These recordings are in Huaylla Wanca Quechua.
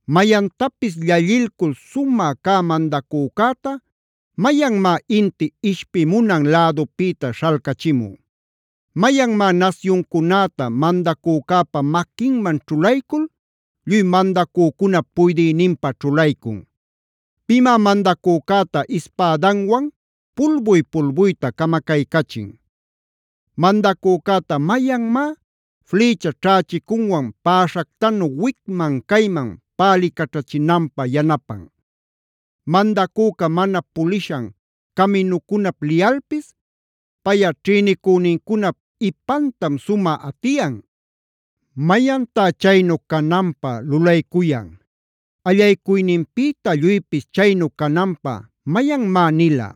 “Mayantapis llallilcul sumä cä mandacücäta, ¿mayanmá inti ishpimunan lädupïta śhalcachimun? ¿Mayanmá nasyuncunäta mandacücäpa maquinman ćhulaycul lluy mandacücunap puydïninpä ćhulaycun? ¿Pimá mandacücäta ispädanwan pulbuy-pulbuyta camacaycachin? ¿Mandacücäta mayanmá flïcha ćhächicunwan päśhactanu wicman-cayman pälïcaćhachinanpä yanapan? Mandacüca mana pulishan caminucunap liyalpis payꞌa ćhïnicünincunap ipantam sumä atiyan. ¿Mayantá chaynu cananpä lulaycuyan? ¿Allaycuyninpïta lluypis chaynu cananpä mayanmá nila?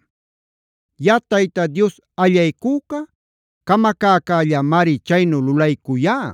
Yaꞌa Tayta Dios allaycüca camacäcällamari chaynu lulaycuyá.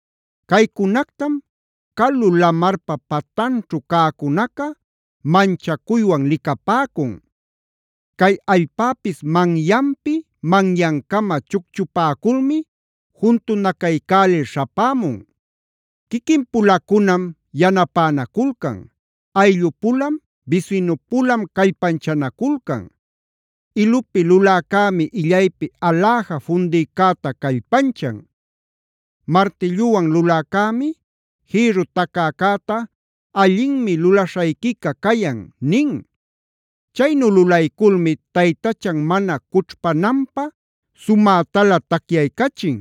“Caycunactam calu lamarpa patanćhu cäcunaca manchacuywan licapäcun; cay allpäpis manyanpi manyancama chucchupäculmi juntunacaycälil śhapämun. Quiquin-pulacunam yanapänaculcan; ayllu-pulam, bisinu-pulam callpanchanaculcan. Ilupi luläcämi illaypi aläja fundïcäta callpanchan; martilluwan luläcämi jïrru tacäcäta: ‘Allinmi lulaśhayquica cayan’ nin. Chaynu lulayculmi taytachan mana cućhpananpä sumätalä tacyaycachin.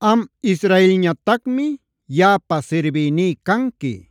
“Am Israelñatacmi yaꞌapa sirbïní canqui;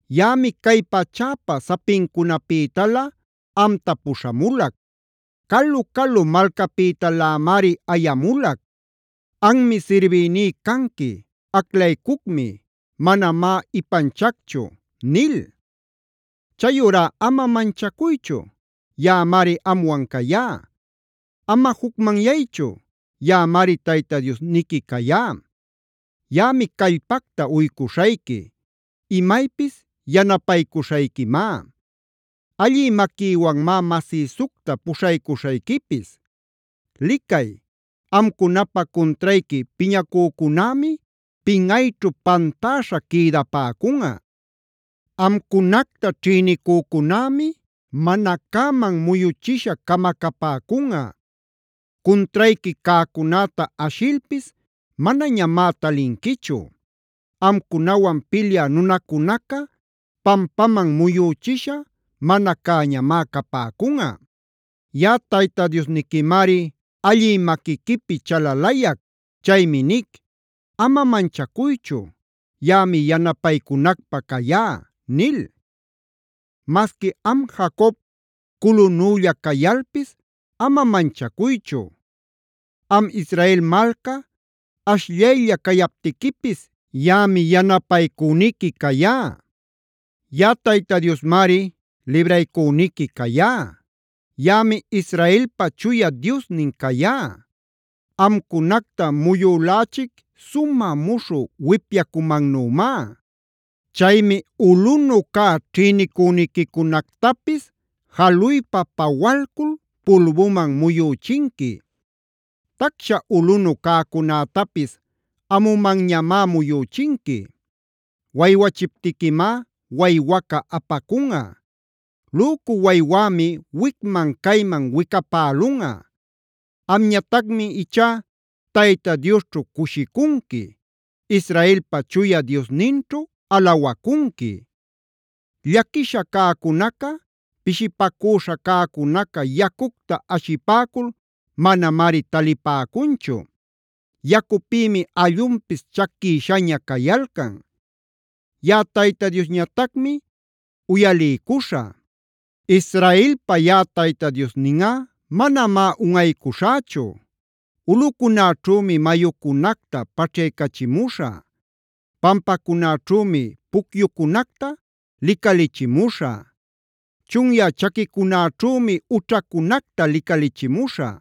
Yaꞌami cay pachäpa sapincunapïtalä amta puśhamulac; calu-calu malcapïtalämari ayamulac: ‘Anmi sirbïní canqui; aclaycucmi; manamá ipanchacchu’ nil. Chayurá ama manchacuychu; yaꞌamari amwan cayá. Ama jucmanyaychu; yaꞌamari Tayta Diosniqui cayá. Yaꞌami callpacta uycuśhayqui; imaypis yanapaycuśhayquimá; allï maquïwanmá masïsucta puśhaycuśhayquipis. “Licay, amcunapä cuntrayqui piñacücunämi pinꞌayćhu pantäśha quïdapäcunꞌa. Amcunacta ćhïnicücunämi mana cäman muyuchisha camacapäcunꞌa. Cuntrayqui cäcunäta ashilpis manañamá talinquichu; amcunawan pilyä munäcunaca pampaman muyüchisha, mana cäñamá capäcunꞌa. Yaꞌa Tayta Diosniquimari allï maquiquipi chalalayac. Chaymi nic: ‘Ama manchacuychu; yaꞌami yanapaycunacpä cayá’ nil. “Masqui am Jacob, culunülla cayalpis, ama manchacuychu. Am Israel malca, ashllaylla cayaptiquipis, yaꞌami yanapaycüniqui cayá. Yaꞌa Tayta Diosmari libraycüniqui cayá; yaꞌami Israelpa Chuya Diosnin cayá. Amcunacta muyülächic sumä muśhü wipyacumannümá. Chaymi ulꞌunu cä ćhïnicüniquicunactapis jaluypa pawalcul pulbuman muyüchinqui; tacsha ulꞌunu cäcunätapis amumanñamá muyüchinqui. Waywachiptiquimá waywaca apacunꞌa; lücu waywämi wicman-cayman wicapälunꞌa. Amñatacmi ichá Tayta Diosćhu cushicunqui; Israelpa Chuya Diosninćhu alawacunqui. “Llaquisha cäcunaca, pishipacüśha cäcunaca yacucta ashipäcul manamari talipäcunchu; yacupïmi allunpis chaquïshaña cayalcan. Yaꞌa Tayta Diosñatacmi uyaliycuśhä; Israelpa yaꞌa Tayta Diosninꞌa manamá unꞌaycuśhächu. Ulꞌucunäćhümi mayucunacta paćhyachimuśhä; pampacunäćhümi pucyucunacta licalichimuśhä; chunyä chaquicunäćhümi ućhacunacta licalichimuśhä;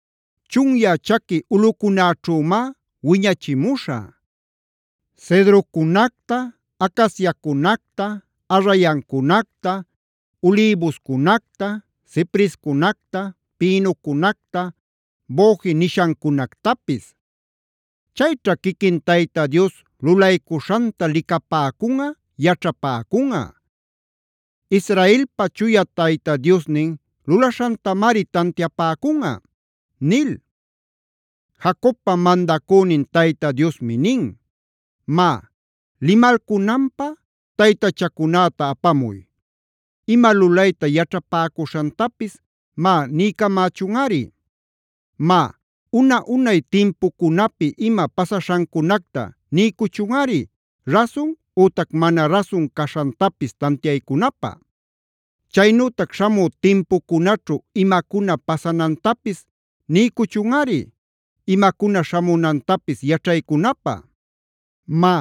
Chunyä chaqui ulꞌucunäćhümá wiñachimuśhä: cedrocunacta, acaciacunacta, arrayancunacta, ulïbuscunacta, ciprescunacta, pinocunacta, boje nishancunactapis. Chayćha quiquin Tayta Dios lulaycuśhanta licapäcunꞌa, yaćhapäcunꞌa; Israelpa Chuya Tayta Diosnin lulaśhantamari tantiapäcunꞌa” nil. Jacobpa mandacünin Tayta Diosmi nin: “Má, limalcunanpä taytachacunäta apamuy; ima lulayta yaćhapäcuśhantapis, má niycamächunꞌari. Má, una-unay timpucunapi ima pasaśhancunacta niycuchunꞌari rasun ütac mana rasun caśhantapis tantiaycunapä. Chaynütac śhamü timpucunaćhu imacuna pasanantapis niycuchunꞌari imacuna śhamunantapis yaćhaycunapä. Má,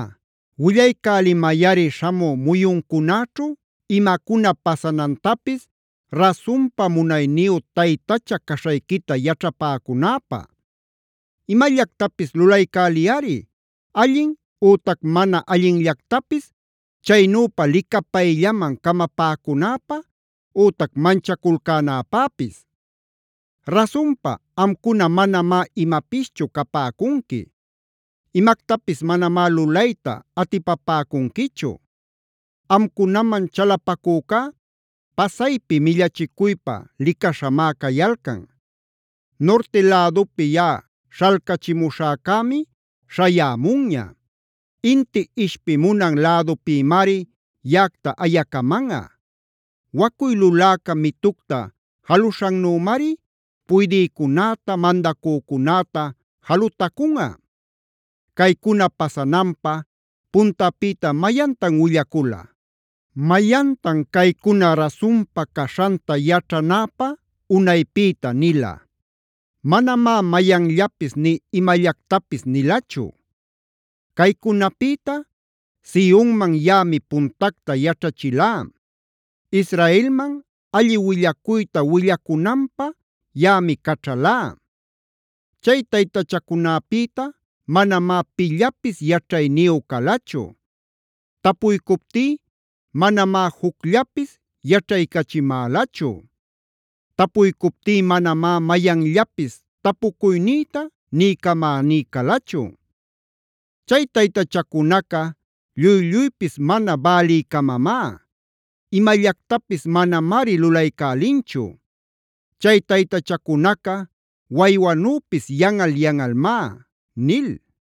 willaycälimayꞌari śhamü muyuncunäćhu imacuna pasanantapis rasunpa munayniyu taytacha caśhayquita yaćhapäcunäpä. Imallactapis lulaycäliyꞌari allin ütac mana allinllactapis, chaynüpa licapayllaman camapäcunäpä ütac manchaculcänäpäpis. Rasunpa, amcuna manamá imapischu capäcunqui;d imactapis manamá lulayta atipapäcunquichu. Amcunaman chalapacücá pasaypi millachicuypä licaśhamá cayalcan. “Nurti lädupi yaꞌa śhalcachimuśhäcämi śhayämunña; inti ishpimunan lädupïmari yaꞌacta ayacamanꞌa; wacuy luläca mitucta jaluśhannümari puydïcunäta, mandacücunäta jalutacunꞌa. Caycuna pasananpä ¿puntapïta mayantan willacula? ¿Mayantan caycuna rasunpa caśhanta yaćhanäpä unaypïta nila? Manamá mayanllapis nï imallactapis nilachu. “Caycunapïta Sionman yaꞌami puntacta yaćhachilá; Israelman alli willacuyta willacunanpä yaꞌami caćhalá. Chay taytachacunäpïta manamá pillapis yaćhayniyu calachu; tapuycuptí manamá jucllapis yaćhaycachimälachu; tapuycuptí manamá mayanllapis tapucuynïta niycamäní calachu. Chay taytachacunaca lluy-lluypis mana bälïcamamá; imallactapis manamari lulaycälinchu; chay taytachacunaca waywanüpis yanꞌal-yanꞌalmá” nil.